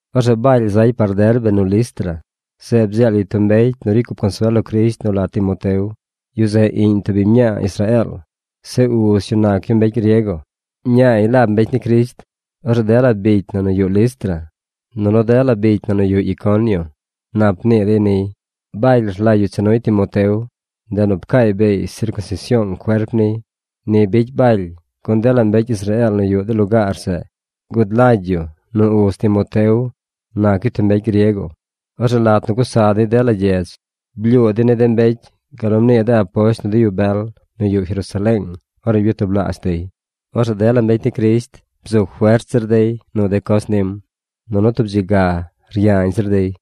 Orzeꞌ Baly zay par Derbe nu Listra. Zeꞌ bdzeel yu tub mbecy nu ricy cup consuel lo Crisht nu la Timoteo. Yu zeꞌ iꞌñ tub biñ mñaa Israeel. Zeꞌ uz yu nac yu mbecy griego. Ñaay laab mbecy ni Crisht. Orzeꞌ dela bicy na nu yuꞌ Listra, nunu dela bicy na nu yuꞌ Iconio nap mnii dey niy. Baly rlagy yu cha nuy Timoteo, ndeꞌ nu pcaay beey sircunsision cuerp niy. Ni bicy Baly, gun dela mbecy Israeel nu yuꞌ de lugaar zeꞌ gud lagy yu nu uz Timoteo nac yu tub mbecy griego. Orzeꞌ lat nu gusa dey dela gyedz, blyuu dey ni de mbecy gal nu mnii de aposht nu de yu bel nu yuꞌ Jerusaleeng ornu byatublaazh dey. Orzeꞌ dela mbecy ni Crisht fert zir guc nu dey de coz nim, nunu tub dzi ga ryañ zir dey.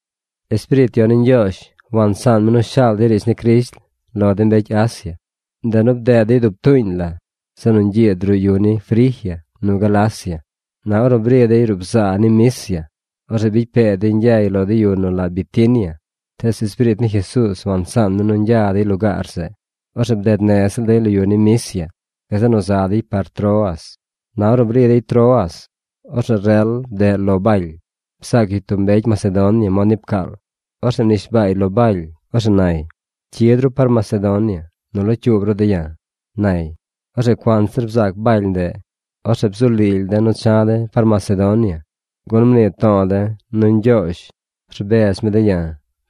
Espiriit Yon ni Ñgyoozh wansaan mi nu shaal dey riidz ni Crisht lo de mbecy Asia, ndeꞌ nu bded dey dub tuuñ la zeꞌ nu ñgyiid ruꞌ yu ni Frigia nu Galacia. Na ornu bri dey ruꞌ bzaa ni Misia, orzeꞌ bicy pee dey ñgyay lo de yu nu la Bitinia. Tees Espiriit ni Jesuuz wansaan mi nu ñgya dey lugaar zeꞌ. Orzeꞌ bded nez ziꞌl dey lo yu ni Misia. Gazeꞌ nu za dey par Troas. Na ornu bri dey Troas, orzeꞌ rel bdeꞌ lo Baly. Bzaac yu tub mbecy Macedonia mod ni pcaal. Orzeꞌ mnishbaay lo Baly. Orzeꞌ nay: “Cyid ru par Macedonia nu locyuub ru de̱ ya̱”, nay. Orzeꞌ cuanzir bzaac Baly ndeꞌ, orzeꞌ bzu lily de̱ nu cha̱ de̱ par Macedonia, gun mnii to̱o̱ de̱ nu Ñgyoozh bredz mi de̱ ya̱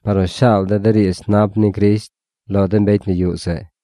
par nu shaal de̱ de riidz nap ni Crisht lo de mbecy nu yuꞌ zeꞌ.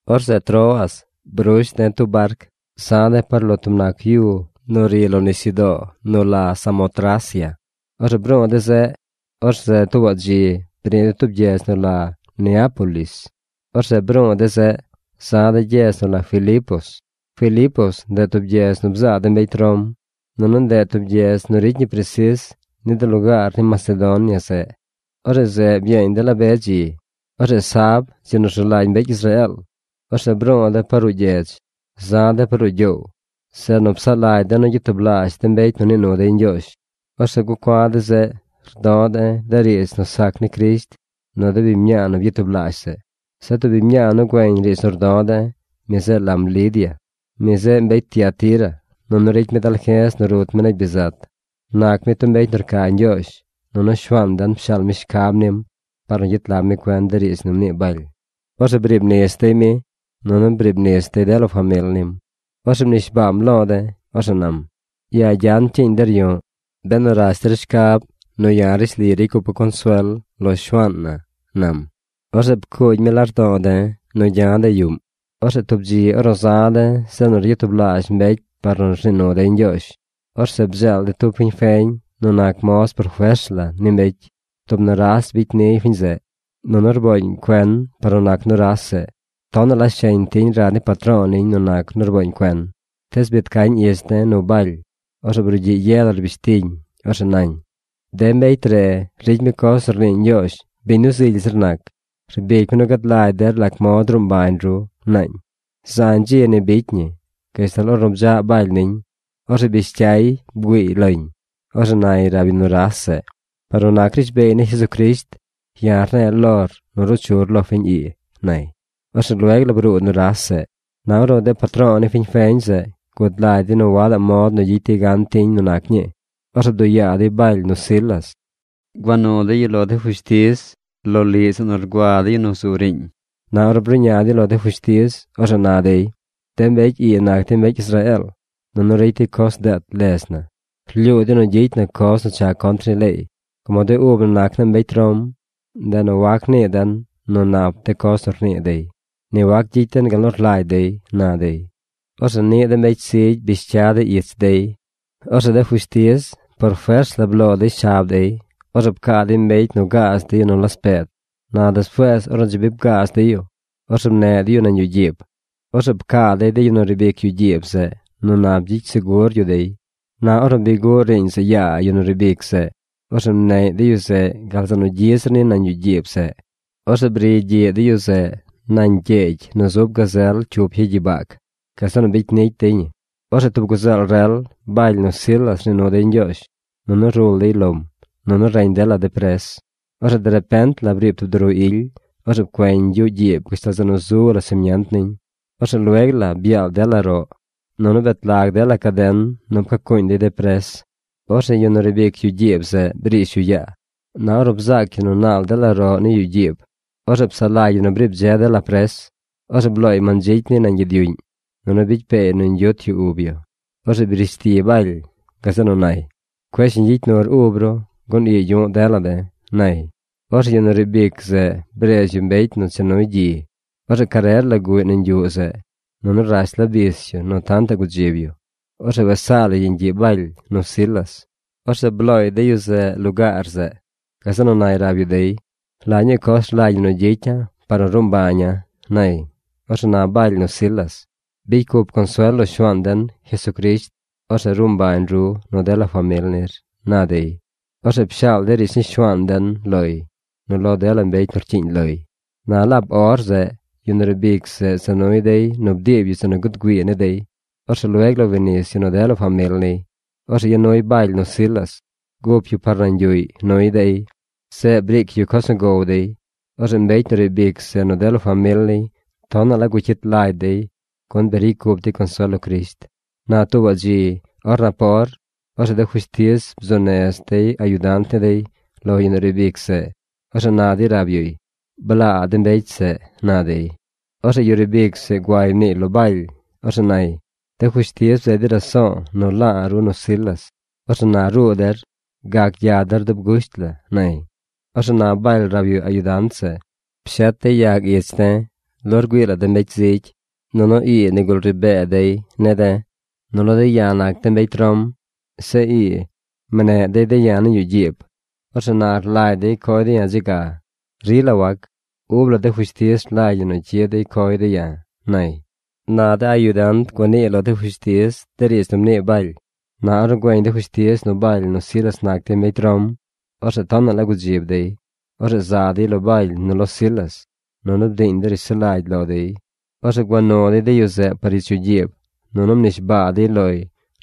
Orzeꞌ Troas brush de̱ tub barc. Za̱ de̱ par lo tub nac yu nu ri lo nisyudoo nu la Samotracia. Orzeꞌ bru̱u̱ de̱ zeꞌ. Orzeꞌ tuubaꞌ dzi bri̱ de̱ tub gyedz nu la Neápolis. Orzeꞌ bru̱u̱ de̱ zeꞌ. Za̱ de̱ gyedz nu la Filipos. Filipos, ndeꞌ tub gyedz nu bzaa de mbecy Rom, nunu ndeꞌ gyedz nu ricy ñi presis ni de lugaar ni Macedonia zeꞌ. Orzeꞌ zeꞌ byeeñ de̱ la be dzi. Orzeꞌ sab, dzi nu rzu lagy mbecy Israeel, orzeꞌ bru̱u̱ de̱ par ruꞌ gyedz. Za̱ de̱ par ruꞌ gyoow, zeꞌ nu psaꞌ lagy de̱ nu gyatublaazh mbecy nu nii nu dey Ñgyoozh. Orzeꞌ gucua̱ de̱ zeꞌ rdo̱ de̱ de riidz nu sac ni Crisht nu de biñ mñaa nu byatublaazh zeꞌ. Zeꞌ tub biñ mñaa nu güeñ riidz nu rdo̱ de̱, mi zeꞌ lam Lidia. Mi zeꞌ mbecy Tiatira nunu ricy mi dalje̱z nu rut mi negy bizat. Nac mi tub mbecy nu rca Ñgyoozh, nunu Shuaan den pshaal mi shcab nim par nu gyet lag mi cuen de riidz nu mnii Baly. Orzeꞌ briib nis dey mi, nunu briib nis dey dela famil nim. Orzeꞌ mnishbaam lo de̱. Orzeꞌ nam: ―Yaa gyan cyiiñ der yu̱ꞌ benu rash der shcab nu ya̱ rishli ricy cupa̱ consuel lo Shuaan na ―nam. Orzeꞌ pcuugy mi lardo̱o̱ de̱ nu gya̱ de̱ yuꞌm. Orzeꞌ tub dzi ornu za̱ de̱ zeꞌ nu ryatublaazh mbecy par nu rnii nu dey Ñgyoozh, orzeꞌ bdzeel de̱ tub fiñ feñ nu nac moz por fers la ni mbecy. Tub nuras bicy niy fiñ zeꞌ, nunu rbooñ cuen par nu nac nuras zeꞌ. Tonaꞌ la sheñ tiñ rad ni patro̱o̱ ñiñ nu nac nu rbooñ cuen. Tees biid cañ ich de̱ nu Baly, orzeꞌ brugyiꞌ ye la rbish tiñ. Orzeꞌ nañ: ―¡De mbecy re ricy mi coz nu rnii Ñgyoozh biñ nu zily zir nac! ¡Rbic mi nu gad lagy der lac mod ruu mbañ ru! ―naañ. Zañ dzi ni bicy ñi gashtal ornu bdzaꞌ Baly niñ. Orzeꞌ bish cyay bgüiiñ loñ. Orzeꞌ nay rab yu nuras zeꞌ: ―Par nu nac rishbeey ni Jesucrisht, ya̱ rne̱e̱ lor nu ruu chur lo fiñ ii ―nay. Orzeꞌ lueg la bruu nuras zeꞌ. Na ornu de patro̱o̱ ni fiñ feñ zeꞌ gud lagy dey nu wadaꞌ mod nu gyicy dey gan tiñ nu nac ñii, orzeꞌ bduꞌ yaa dey Baly nu Silas. Gua nu dey yu lo de fushtiz loliꞌ zeꞌ nu rgua de yu zu riiñ. Na ornu bruꞌña dey lo de fushtiz, orzeꞌ na dey: ―De mbecy ii nac dey mbecy Israeel, nunu ricy dey coz deet ledz na. Rlyuu dey nu gyicy na coz nu cha contr ni leey. Como de ub na nac na mbecy Rom, ndeꞌ nu wac nii den nu nap de coz nu rnii dey. Ni wac gyicy den gal nu rlagy dey ―na dey. Orzeꞌ niꞌ de mbecy zigy bish cya dey ich dey. Orzeꞌ de fushtiz por fers la bloo dey shab dey. Orzeꞌ pcaa dey mbecy nu gaaz dey yu nu laspeed. Na despuees ornu dzi bi bgaaz dey yu, orzeꞌ mneꞌ dey yu nañ yuꞌ gyiib. Orzeꞌ pcaa dey de yu nu riib ic yuꞌ gyiib zeꞌ nu nap gyicy segur yu dey. Na ornu bi guꞌ riiñ zeꞌ yaa yu nu riib ic zeꞌ, orzeꞌ mneꞌy de yu zeꞌ gal zeꞌ nu gyi zir ni nañ yuꞌ gyiib zeꞌ. Orzeꞌ briy gyiꞌ de yu zeꞌ nañ gyeegy nu zub gazel cyup ya gyibag. Gazeꞌ nu bicy nicy dey ñi. Orzeꞌ tub guzeel rel, Baly nu Silas rnii nu dey Ñgyoozh, nunu rul dey lom. Nunu reñ dela de pres. Orzeꞌ derepent la briib tub duru ily. Orzeꞌ pcueñ yuꞌ gyiib gashtal zeꞌ nu zu laa simient niñ. Orzeꞌ lueg la byaal dela roꞌ, nunu bet lag dela caden nu pcacuuñ dey de pres. Orzeꞌ yu nu riib ic yuꞌ gyiib zeꞌ brish yu yaa. Na ornu bzaac yu nu naal dela roꞌ ni yuꞌ gyiib, orzeꞌ psaꞌ lagy yu nu briib dze dela pres. Orzeꞌ blooy mandzicy niy nañ gyid yuꞌñ, nunu bicy peey nu ñgyuut yu ub yu. Orzeꞌ brish ti Baly. Gazeꞌ nu nay: ―¡Cueꞌ shiñ gyicy nur ub ru gun ii yu̱ꞌ dela de̱! ―nay. Orzeꞌ yu nu riib ic zeꞌ bredz yu mbecy nu cha nuy gyi. Orzeꞌ carer la guꞌy nañ yuꞌ zeꞌ. Nunu rash la bis yu nu tantaꞌ gudzib yu. Orzeꞌ wes saa lay yeñ gyiꞌ Baly nu Silas. Orzeꞌ blooy de yu zeꞌ lugaar zeꞌ. Gazeꞌ nu nay rab yu dey: ―¿La ñuu coz rlagy ñi nu gyicya̱ par nu ruu mbaña̱? ―nay. Orzeꞌ na Baly nu Silas: ―Bicy cup consuel lo Shuaan den, Jesucrisht. Orzeꞌ ruu mbañ ru nu dela famil nir ―na dey. Orzeꞌ pshaal dey riidz ni Shuaan den loy nu lo dela mbecy nu rcyiiñ loy. Na laab or zeꞌ yu nu riib ic zeꞌ za nuy dey nu bdiib yu zeꞌ nu guud güii ni dey. Orzeꞌ lueg la wi nis yu nu dela famil niy. Orzeꞌ ya nuy Baly nu Silas. Gup yu par nañ yuꞌy nuy dey. Zeꞌ briic yu coz nu gow dey. Orzeꞌ mbecy nu riib ic zeꞌ nu dela famil niy tonaꞌ la gucyit lagy dey gun bi ricy cup dey consuel lo Crisht. Na tuubaꞌ dzi or napor, orzeꞌ de fushtiz bzuu nez dey ayudant ni dey lo yu nu riib ic zeꞌ. Orzeꞌ na dey rab yuy: ―Blaa de mbecy zeꞌ ―na dey. Orzeꞌ yu riib ic zeꞌ gua mniiy lo Baly. Orzeꞌ nay: ―De fushtiz bzeed dey raso̱o̱ nu la̱a̱ ru nu Silas. Orzeꞌ na ruu der. Gac gya der dub gusht la ―nay. Orzeꞌ na Baly rab yu ayudant zeꞌ: ―Pshet dey yag ich de̱ lo rgüii la de mbecy zigy, nunu ii nigul ri bee dey de̱. Nunu de̱ ya̱ nac de̱ mbecy Rom. Zeꞌ ii mneꞌ dey de̱ ya̱ nañ yuꞌ gyiib. Orzeꞌ na rlagy dey coy de̱ ya̱ dze ga. Rila wac. Ub la de fushtiz rlagy ñi nu cyid dey coy de̱ ya̱ ―nay. Na de ayudant gua niiy lo de fushtiz de riidz nu mnii Baly. Na ornu güeñ de fushtiz nu Baly nu Silas nac dey mbecy Rom, orzeꞌ tonaꞌ la gudzib dey. Orzeꞌ za dey lo Baly nu lo Silas, nunu bdiiñ dey rishsulagy lo dey. Orzeꞌ gua nu dey de yu zeꞌ par ich yuꞌ gyiib nunu mnishbaa dey loy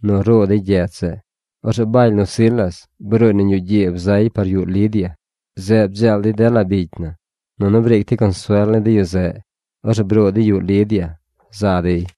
nu ruu dey gyedz zeꞌ. Orzeꞌ Baly nu Silas bruuy nañ yuꞌ gyiib zay par yuꞌ Lidia. Zeꞌ bdzeel dey dela bicy na, nunu briic dey consuel ni de yu zeꞌ. Orzeꞌ bruu dey yuꞌ Lidia za dey.